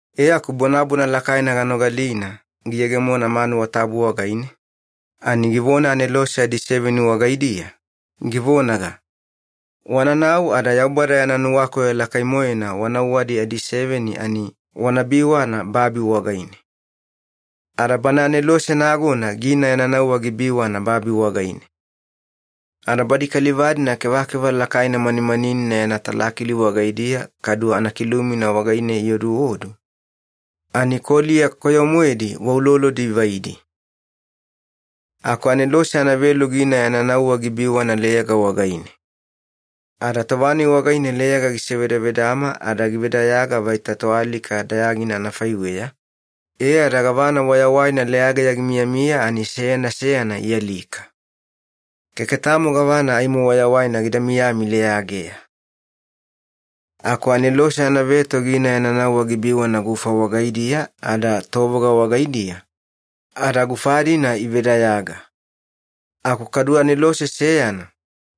E aku bonabona lakaina ganogalina giyegemona manuwa tabu wagaine, ani givona anelose adiseveni wagaidiya, givonaga, “Wananau ada Yaubada yana nuwakoyo lakai-moena wa nauwadi adiseveni ani wana biwana babi wagaine.” Ada bana anelose nagona gina yana nauwa gibiwana babi wagaine. Ada badi kaliva-dina kevakeva lakaina manimaninina yana talakili wagaidiya, kadu anakilumina wagaine ioduodu, ani koliya koyo-moedi wa ulolodi ivaidi. Aku anelose anavelu gina yana nauwa gibiwana leyaga wagaine. Ada tova-nai wagaine leyaga gisevedavedama ada givedayaga vaita toalika dayagina anafaiweya, e ada gavana wayawaina leyageya gimiyamiya ani seyana seyana ialika. Keke tamo gavana aimo wayawaina gida miyami leyageya. Aku anelose anaveto gina yana nauwa gibiwana gufa wagaidiya ada tovoga wagaidiya, ada gufa-dina ivedayaga. Aku kadu anelose seyana,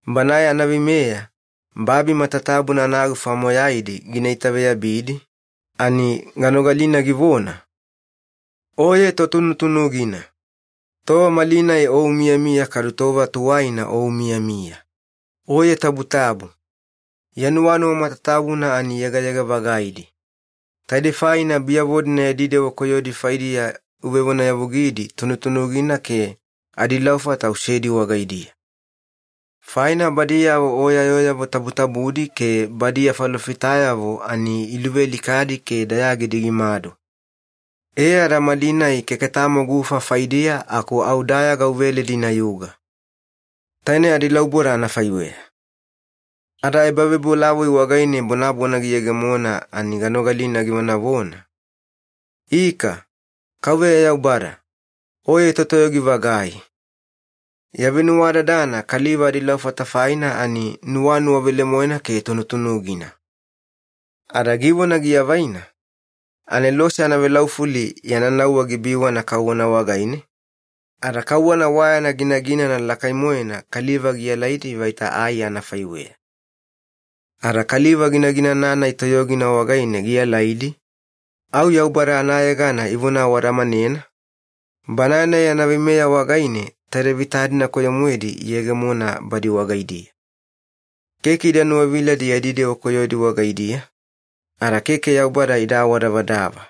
banae anaveimeya babi matatabuna anagufa moyaidi gina itaveyabidi, ani ganogalina givona, “Oye Totunutunugina. Tova malinai O umiyamiya kadu tova tuwaina O umiyamiya. Oye tabutabu. Ya nuwanuwa matatabuna ani yegayega-vagaidi. Taidei faina biyavo-dina yadi dewa koyodi faidiya uvevonayavugidi tunutunugina ke adilaufata usedi wagaidiya. Faina badiyavo O ya yooyavo tabutabudi ke badi ya falofitayavo ani iluvealikadi ke dayagidi gimadu. E ada malinai keke tamo gufa faidiya aku au dayaga uveledi inayuga. Taine adilauboda anafaiweya.” Ada ebavebolavoi wagaine bonabona giyegemona ani ganogalina givonavona, “Ika, Kauveya Yaubada, Oye Totoyogi-vagai. Ya venuwadadana kaliva adilaufata faina ani nuwanuwa velemoena ke tunutunugina.” Ada givona giavaina, anelose anavelaufuli yana nauwa gibiwana kauwana wagaine, ada kauwana wa yana ginaginana lakai-moena kaliva gialaidi vaita ai anafaiweya. Ada kaliva ginaginana-nai toyogina wagaine gialaidi, au Yaubada anayegana ivona awadamanena, Banae-nai yana veimeya wagaine taide vita-dina koyo-moedi iyegemona badi wagaidiya. Keke ida nuwaviladi yadi dewa koyodi wagaidiya, ada keke Yaubada ida awadavadava.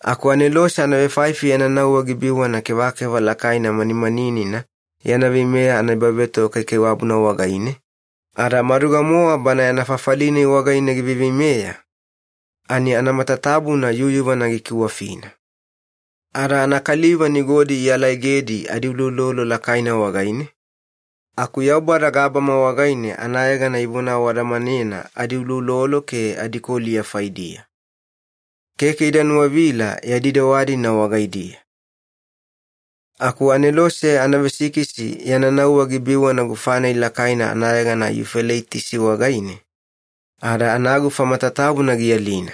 Aku anelose anavefaifi yana nauwa gibiwana kevakeva lakaina manimaninina yana veimeya anaebavetoga kaikaiwabuna wagaine, ada maduga-mowa bana yana fafali-nai wagaine giveiveimeya, ani anamatatabuna yuyuvana gikiwafina. Ada anakaliva nigodi ialaegedi adiuloulolo lakaina wagaine, aku Yaubada gabama wagaine anayegana ivona awadamanena adiuloulolo ke adikoliya faidiya. Keke ida nuwavila yadi dewa-dina wagaidiya. Aku anelose anavesikisi yana nauwa gibiwana gufa-nai lakaina anayegana Yufeleitisi wagaine, ada anagufa matatabuna gialina.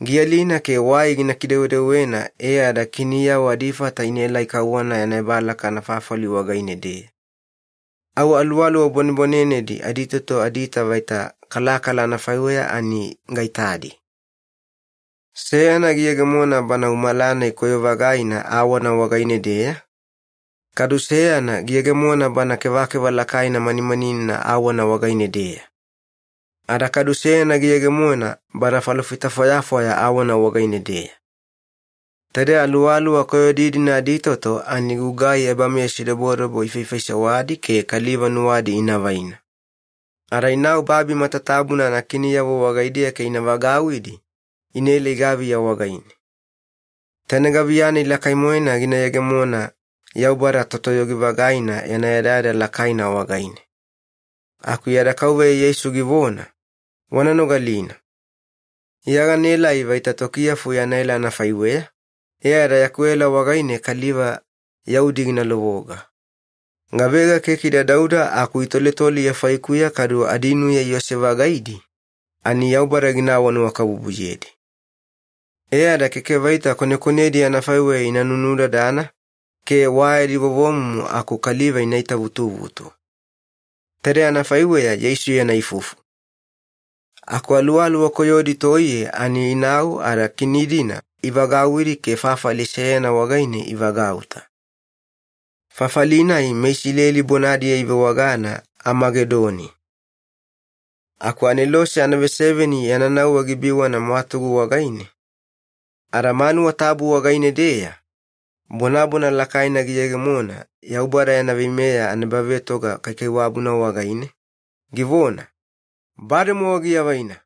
Gialina ke wai gina kidewedewena e ada kiniyavo adifata inaelai kauwana yana ebalaka anafafali wagaine-deya. Au aluwaluwa bwanebwanenedi aditoto adiita vaita kalakala anafaiweya ani gaitadi. Seyana giyegemona bana umala-nai koyo-vagaina awana wagaine-deya, kadu seyana giyegemona bana kevakeva lakaina manimaninina awana wagaine-deya. Ada kadu seyana giyegemona bana falofita fwayafwaya awana wagaine-deya. Taide aluwaluwa koyodi-dina aditoto ani gugai ebameyasidobodobo ifaifaisewadi ke kaliva nuwadi ina vaina. Ada inau babi matatabuna anakiniyavo wagaidiya ke ina vagauwidi inaelai gaviya wagaine. Taine gaviya-nai lakai-moena gina yegemona Yaubada Totoyogi-vagaina yana yadayada lakaina wagaine. Aku yada Kauveya Yeisu givona, “Wana nogalina. Iya ganaelai vaita tokiyafu yana ela anafaiweya, e ada yaku ela wagaine kaliva yaudi gina lovoga. Gavega keke ida dauda aku itoletole Iya faikuya kadu adinuya iose-vagaidi, ani Yaubada gina awanuwakabubuyedi. E ada keke vaita konekonedi anafaiweya ina nunudadana, ke wa yadi vovomumu aku kaliva ina itavutuvutu.” Taide anafaiweya Yeisu yana ifufu. Aku aluwaluwa koyodi toiye ani inau ada kini-dina ivagauwidi ke fafali seyana wagaine ivagauta. Fafali-nai meIsileli bonadiya ivewagana Amagedoni. Aku anelose anaveseveni yana nauwa gibiwana mwatugu wagaine, ada manuwa tabu wagaine-deya bonabona lakaina giyegemona Yaubada yana veimeya anaebavetoga kaikaiwabuna wagaine, givona, “Bademowa giavaina!”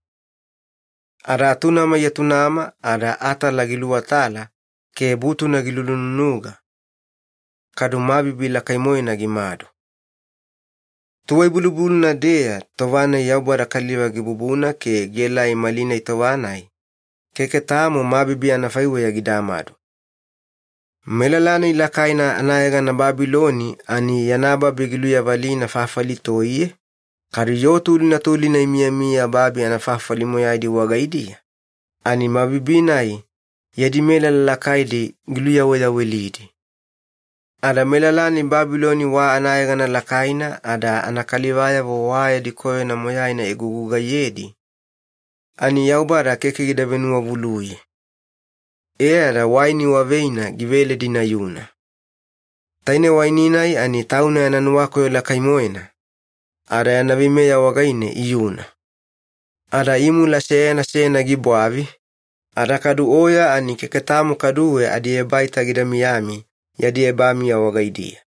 Ada atunama iatunama, ada atala giluwatala, ke butuna gilunununuga, kadu mabibi lakai-moena gimadu. Tuwai-bulubuluna-deya tova-nai Yaubada kaliva gibubuna ke gielai malinai tova-nai, keke tamo mabibi anafaiweya gidamadu. Melala-nai lakaina anayegana Babiloni ani yana babi giluyavalina fafali toiye, kadu yoo tulina tulina imiyamiya babi anafafali moyaidi wagaidiya, ani mabibi-nai yadi melala lakaidi giluyaweyawelidi. Ada melala-nai Babiloni wa anayegana lakaina ada anakalivayavo wa yadi koyona moyaina igugugaiyedi, ani Yaubada keke gida venuwavuluye. E ada waini wa veina giveledi inayuna. Taine waini-nai ani Tauna yana nuwakoyo lakai-moena, ada yana veimeya wagaine iyuna. Ada imula seyana seyana gibwavi, ada kadu oya ani keke tamo kaduwe adiebaita gida miyami yadi ebamiya wagaidiya.